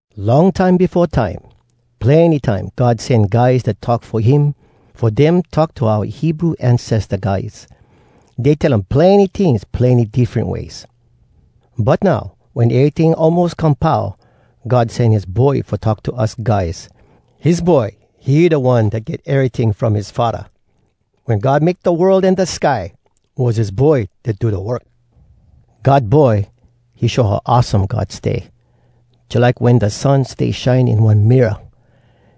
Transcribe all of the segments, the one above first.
Long time befo time, plenny time God sen guys dat talk fo him fo dem talk to oua Hebrew ancesta guys. Dey tell um plenny tings plenny diffren ways. But now, wen eryting almos come pau, God sen his Boy fo talk to us guys. His Boy, he da One dat get eryting from his Faddah. Wen God make da world an da sky, was his Boy dat do da work. God Boy, he show how awesome God stay, Jalike wen da sun stay shine in one mirror.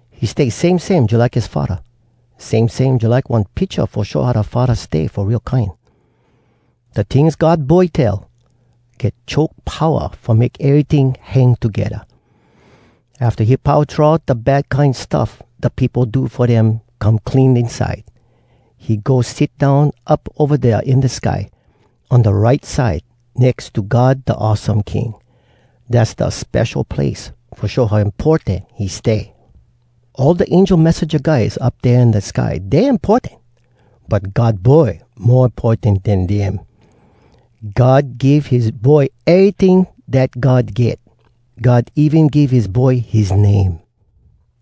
He stay same same jalike his Faddah, Same same jalike one picha Fo show how da Faddah stay fo real kine. Da tings God Boy tell, get choke powa Fo make eryting hang togedda. Afta he pau throw out da bad kine stuff da peopo do Fo dem come clean inside, He go sit down up ova dea in da sky, On da right side nex to God Da Awesome King. Dass da spesho place fo show how importan he stay. All da angel messenja guys up dea in da sky, dey importan. But God Boy mo importan den dem. God give his Boy eryting dat God get. God even give his Boy his name.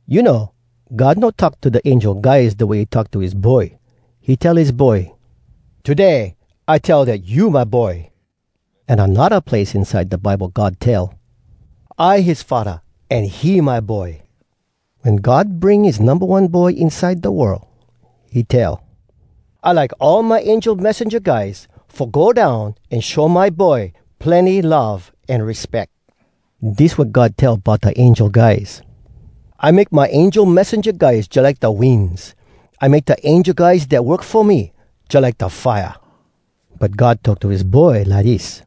You know, God no talk to da angel guys Da way he talk to his Boy. He tell his Boy, “Today I tell Dat you my Boy!” An anodda place inside da Bible God tell, “I his Faddah, An he my Boy.” Wen God bring his Numba One Boy inside da world, he tell, “I like all my angel messenja guys Fo go down an show my Boy plenny love an respeck.” Dis wat God tell bout da angel guys: “I make my angel messenja guys jalike da winds. I make da angel guys dat work fo me jalike da fire.” But God talk to his Boy lidis: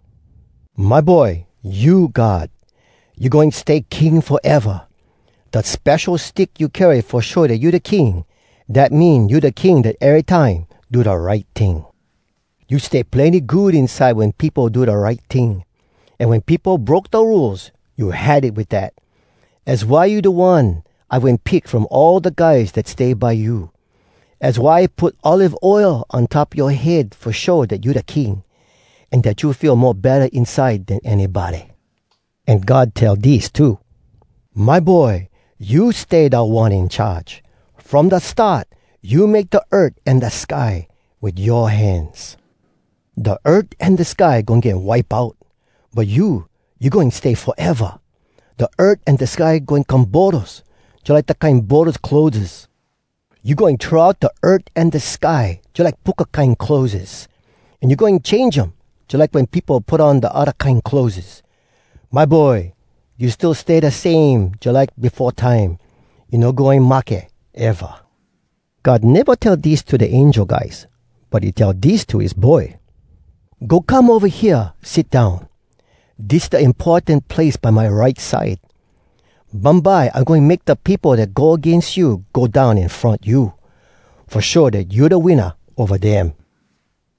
“My Boy, you God. You goin stay king foeva. Da spesho stick you carry fo show dat you da King, Dat mean you da King dat erytime do da right ting. You stay plenny good inside wen peopo do da right ting, An wen peopo broke da Rules, you had it wit dat. Az why you da one I wen pick from all da guys dat stay by you. Az why I put olive oil on top yoa head fo show dat you da King, An dat you feel mo betta inside Den anybody!” An God tell dis too: “My Boy, you stay Da One In Charge. From da start, You make da earth an da sky, Wit yoa hands. Da earth an da sky goin get wipe out. But you, you goin stay foeva! Da earth an da sky goin come boros, Jalike da kine boros clotheses. You goin throw out da earth an da sky, Jalike puka kine clotheses. An you goin change um, Jalike wen peopo put on da odda kine clotheses. My Boy, you still stay da same jalike befo time. You no goin mahke eva!” God neva tell dis to da angel guys, but he tell dis to his Boy: “Go come ova hea, sit down! Dis da importan place by my right side. Bumbye I goin make da peopo dat go agains you Go down in front you, Fo show dat you da winna ova dem.”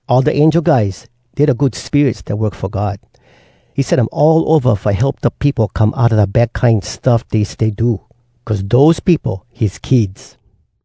All da angel guys, dey da good spirits dat work fo God. He sen um all ova fo help da peopo come outa da bad kine stuff dey stay do cuz dose peopo his kids.